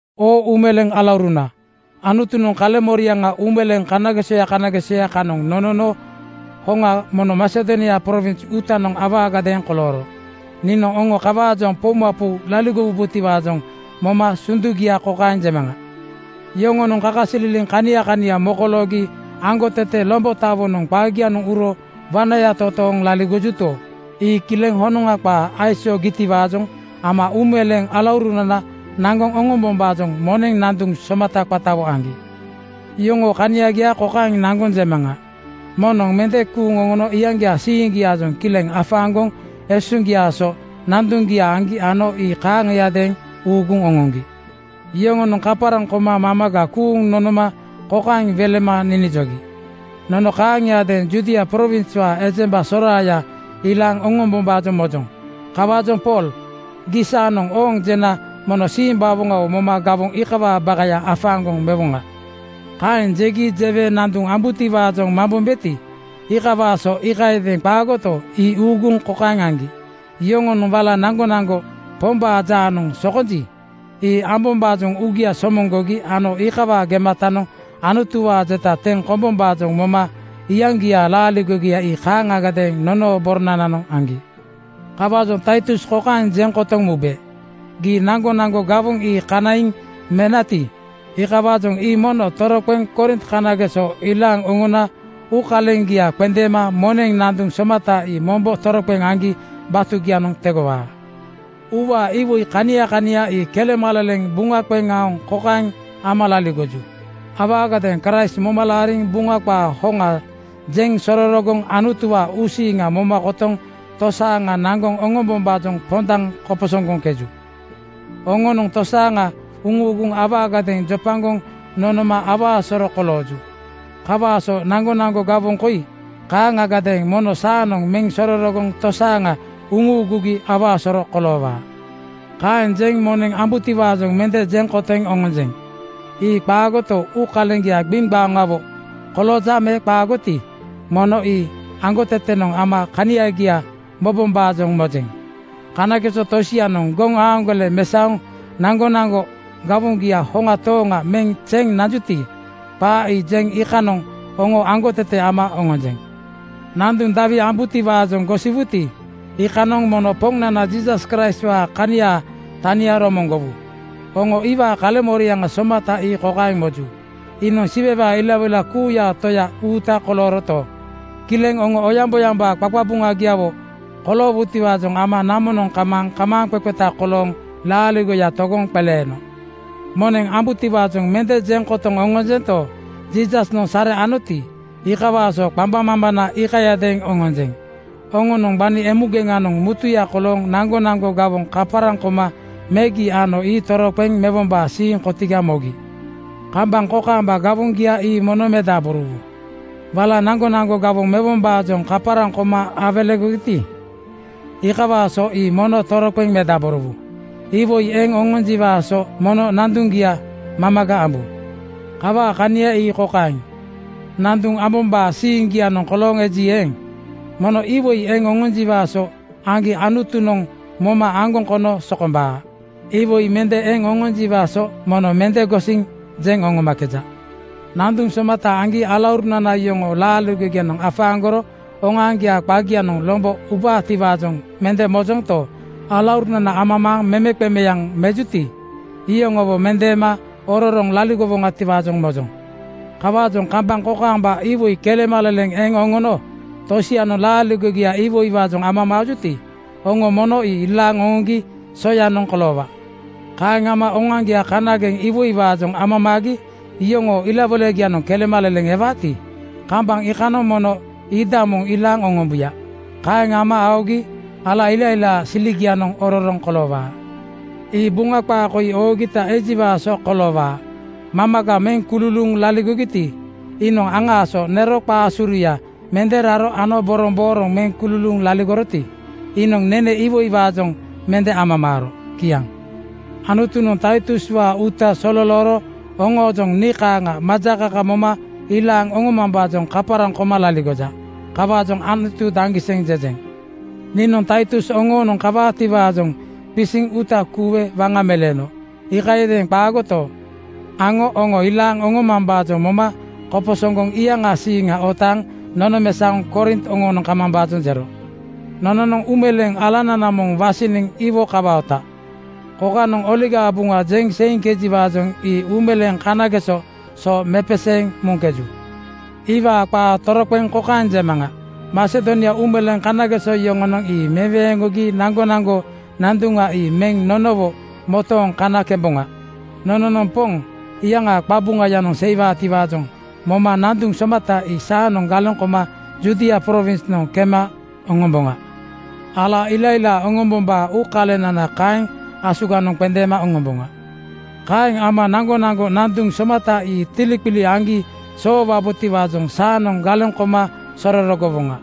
Oo uumeleeŋ alauruna, Anutunoŋ kaleŋmoriaŋa uumeleeŋ kanagesoya kanagesoya kanoŋ nonono hoŋa mono Masedonia prowins uutanoŋ awaagadeeŋ kolooro. Niinoŋ oŋo kawaajoŋ poumapou laligowubotiwaajoŋ moma sundugia kokaeŋ jemaŋa: Yoŋonoŋ kakasililiŋ kania kania mokoloogi aŋgotete lombotawonoŋ qagianoŋ uro wanaya totooŋ laligojuto, ii kileŋ honoŋa qaa aisoogitiwaajoŋ ama uumeleeŋ alaurunana naŋgoŋ oŋombombaajoŋ moneŋ nanduŋ somata qatawo aŋgi. Yoŋoo kaniagia kokaeŋ naŋgoŋ jemaŋa: Moŋnoŋ mende kuuŋ oŋono iyaŋgiaa siiŋgiaajoŋ kileŋ afaaŋgoŋ esuŋgiaa so nanduŋgia aŋgi ano ii kaaŋiadeeŋ uuguŋ oŋoŋgi. Yoŋonoŋ kaparaŋ koma mamaga kuuŋ nonoma kokaeŋ welema ninijogi, “Nono kaaŋiadeeŋ Judia prowinswaa ejemba soraaya ilaaŋ oŋombombaajoŋ mojoŋ. Kawaajoŋ Pool, gii saanoŋ ‘Ooŋ!’ jena mono simbawoŋawo moma gawoŋ iikawaa bakaya afaaŋgoŋ mewoŋa.” Kaeŋ jegi jewe nanduŋ ambutiwaajoŋ mambombeti, iikawaa so iikayadeeŋ qaagoto, ii uuguŋ kokaeŋ aŋgi: Yoŋonoŋ wala naŋgonaŋgo Pombaa jaanoŋ sokonji, ii ambombaajoŋ uugia somoŋgogi ano iikawaa gematanoŋ Anutuwaa jeta teŋ kombombaajoŋ moma iyaŋgiaa laaligogia ii kaaŋagadeeŋ nonoo boronananoŋ aŋgi. Kawaajoŋ Taitus kokaeŋ jeŋ kotoŋ mube, “Gii naŋgonaŋgo gawoŋ ii kanaiŋ menati, iikawaajoŋ ii mono toroqeŋ Korint kanageso ilaaŋ oŋona uukaleŋgia qendeema moneŋ nanduŋ somata ii mombo toroqeŋ aŋgi batugianoŋ tegowaa.” Uuwaa iwoi kania kania ii kelemaleleŋ buŋa qeŋ aoŋ kokaeŋ ama laligoju: Awaagadeeŋ Kraist moma laariŋ Buŋa qaa hoŋa jeŋ sororogoŋ Anutuwaa uusiiŋa moma kotoŋ tosaaŋa naŋgoŋ oŋombombaajoŋ pondaŋ koposoŋgoŋkeju. Oŋonoŋ tosaaŋa uŋuuguŋ awaagadeeŋ jopagoŋ nonoma awaa soro kolooju. Kawaa so naŋgonaŋgo gawoŋ koi kaaŋagadeeŋ mono saanoŋ meŋ sororogoŋ tosaaŋa uŋuugugi awaa soro koloowaa. Kaeŋ jeŋ moneŋ ambutiwaajoŋ mende jeŋ kotoŋ oŋonjeŋ. Ii qaagoto, uukaleŋgia gbiŋgbaoŋawo kolooja me qaagoti, mono ii aŋgotetenoŋ ama kaniagia momambaajoŋ mojeŋ. Kanageso tosianoŋ goŋaaŋgole mesaoŋ naŋgonaŋgo gawoŋgia hoŋa tooŋa meŋ zeŋ nanjuti, qaa ii jeŋ iikanoŋ oŋo aŋgotete ama oŋonjeŋ. Nanduŋ dawi ambutiwaajoŋ gosiwuti, iikanoŋ mono Poŋnana Jiisas Kraistwaa kaniaa tania romoŋgowu. Oŋo iwaa kaleŋmoriaŋa somata ii kokaeŋ moju: Iinoŋ Siwewaa ilawoila kuuyaa Toya uuta kolooroto, kileŋ oŋo oyaŋboyambaa qaqabuŋagiawo koloowutiwaajoŋ ama namonoŋ kamaaŋ kamaaŋqeqeta kolooŋ laaligoya togoŋ qeleeno. Moneŋ ambutiwaajoŋ mende jeŋ kotoŋ oŋonjento, Jiisasnoŋ sare anoti, iikawaa so qambaŋmambana iikayadeeŋ oŋonjeŋ. Oŋonoŋ gbani emugeŋanoŋ mutuya kolooŋ naŋgonaŋgo gawoŋ kaparaŋ koma megi ano ii toroqeŋ mewombaa siiŋ kotiga mogi. Kambaŋ kokaamba gawoŋgia ii mono medaborowu. Wala naŋgonaŋgo gawoŋ mewombaajoŋ kaparaŋ koma awelegogiti, iikawaa so ii mono toroqeŋ medaborowu. Iwoi eŋ oŋonjiwaa so mono nanduŋgia mamaga ambu. Kawaa kania ii kokaeŋ: Nanduŋ ambombaa siiŋgianoŋ kolooŋ eji eeŋ, mono iwoi eŋ oŋonjiwaa so aŋgi Anutunoŋ moma aŋgoŋ kono sokombaa. Iwoi mende eŋ oŋonjiwaa so mono mende gosiŋ jeŋ oŋomakeja. Nanduŋ somata aŋgi alaurunana yoŋoo laaligogianoŋ afaaŋgoro oŋoaŋgiaa qagianoŋ lombo ubaatiwaajoŋ mende mojonto, alaurunana amamaaŋ memeqemeaŋ mejuti, iyoŋowo mendeema ororoŋ laligowoŋatiwaajoŋ mojoŋ. Kawaajoŋ kambaŋ kokaamba iwoi kelemaleleŋ eŋ oŋono tosianoŋ laaligogiaa iwoiwaajoŋ amamaajuti, oŋo mono ii ilaaŋ oŋoŋgi soyanoŋ koloowaa. Kaeŋ ama oŋoaŋgia kanageŋ iwoiwaajoŋ amamaagi yoŋoo ilawoilagianoŋ kelemaleleŋ ewaati, kambaŋ iikanoŋ mono iidamoŋ ilaaŋ oŋombuya. Kaeŋ ama aogi ala ilailaa siligianoŋ ororoŋ koloowaa. Ii Buŋa qaa koi oogita ejiwaa so koloowaa, “Mamaga meŋ kululuuŋ laligoroti, iinoŋ aŋaa so nero qaa suruya mende raro ano borombooroŋ meŋ kululuuŋ laligoroti, iinoŋ nene iwoiwaajoŋ mende amamaaro.” Kiaŋ. Anutunoŋ Taituswaa uuta sololooro oŋoojoŋ nii kaaŋa majakaka moma ilaaŋ oŋomambaajoŋ kaparaŋ koma laligoja. Kawaajoŋ “Anutu daŋgiseŋ!” jejeŋ. Niinoŋ Taitus oŋoonoŋ kawaatiwaajoŋ qisiŋ uuta kuuwe waŋa meleeno. Iikayadeeŋ qaagoto, aŋo oŋo ilaaŋ oŋomambaajoŋ moma koposoŋgoŋ iyaŋaa siiŋa otaaŋ nonomesaoŋ Korint oŋoonoŋ kamambaajoŋ jero. Nononoŋ uumeleeŋ alanana moŋ wasiniŋ iwo kawaota. Kokanoŋ Oligaa Buŋa jeŋ seiŋkejiwaajoŋ ii uumeleeŋ kanageso so mepeseeŋ muŋkeju. Iwaa qaa toroqeŋ kokaeŋ jemaŋa: Masedonia uumeleeŋ kanageso yoŋonoŋ ii meweeŋgogi naŋgonaŋgo nanduŋa ii meŋ nonowo motooŋ kana kemboŋa. Nononoŋ Poŋ iyaŋaa qabuŋayanoŋ seiwaatiwaajoŋ moma nanduŋ somata ii saanoŋ galeŋ koma Judia prowinsnoŋ kema oŋomboŋa. Ala ilailaa oŋombombaa uukalenana kaeŋ asuganoŋ qendeema oŋomboŋa. Kaeŋ ama naŋgonaŋgo nanduŋ somata ii tiliqili aŋgi soowabotiwaajoŋ saanoŋ galeŋ koma sororogowoŋa.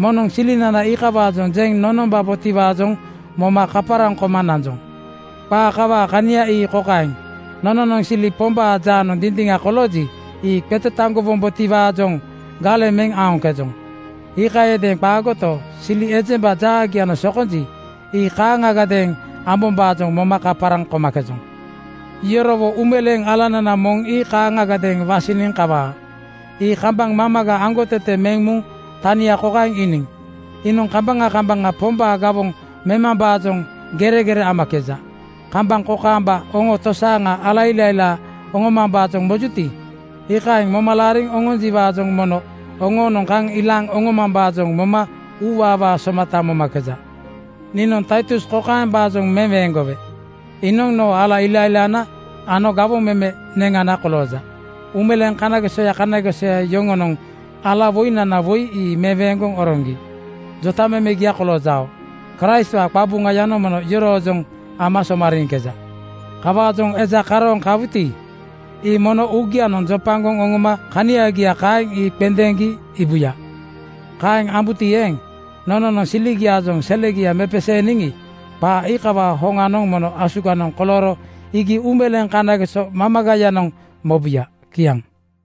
Moŋnoŋ silinana iikawaajoŋ jeŋ nonombabotiwaajoŋ moma kaparaŋ koma nanjoŋ. Qaa kawaa kania ii kokaeŋ: Nononoŋ sili Pombaa jaanoŋ dindiŋa kolooji, ii qetetaŋgowombotiwaajoŋ galeŋ meŋ aoŋkejoŋ. Iikayadeeŋ qaagoto, sili ejemba jaagianoŋ sokonji, ii kaaŋagadeeŋ ambombaajoŋ moma kaparaŋ komakejoŋ. Yorowo uumeleeŋ alanana moŋ ii kaaŋagadeeŋ wasiniŋ kawaa. Ii kambaŋ mamaga aŋgotete meŋ muŋ tania kokaeŋ iiniŋ: Iinoŋ kambaŋa kambaŋa Pombaa gawoŋ memambaajoŋ geregere amakeja. Kambaŋ kokaamba oŋo tosaaŋa ala ilailaa oŋombombaajoŋ mojuti, iikaeŋ moma laariŋ oŋonjiwaajoŋ mono oŋoonoŋ kaŋ ilaaŋ oŋomambaajoŋ moma uuwaawaa somata momakeja. Niinoŋ Taitus kokaembaajoŋ meweeŋgowe: Iinoŋ noo ala ilailaana ano gawoŋ meme neŋana kolooja. Uumeleeŋ kanagesoya kanagesoya yoŋonoŋ alawoinana woi ii meweeŋgoŋ oroŋgi jotamemegia koloojao. Kraistwaa qabuŋayanoŋ mono yoroojoŋ ama somariiŋkeja. Kawaajoŋ eja karooŋ kawuti, ii mono uugianoŋ jopagoŋ oŋoma kaniagia kaeŋ ii qendeeŋgi iibuya. Kaeŋ ambuti eeŋ, nononoŋ siligiaajoŋ selegia mepeseeniŋi, qaa iikawaa hoŋanoŋ mono asuganoŋ kolooro iigi uumeleeŋ kanageso mamagayanoŋ mobuya. Kiaŋ.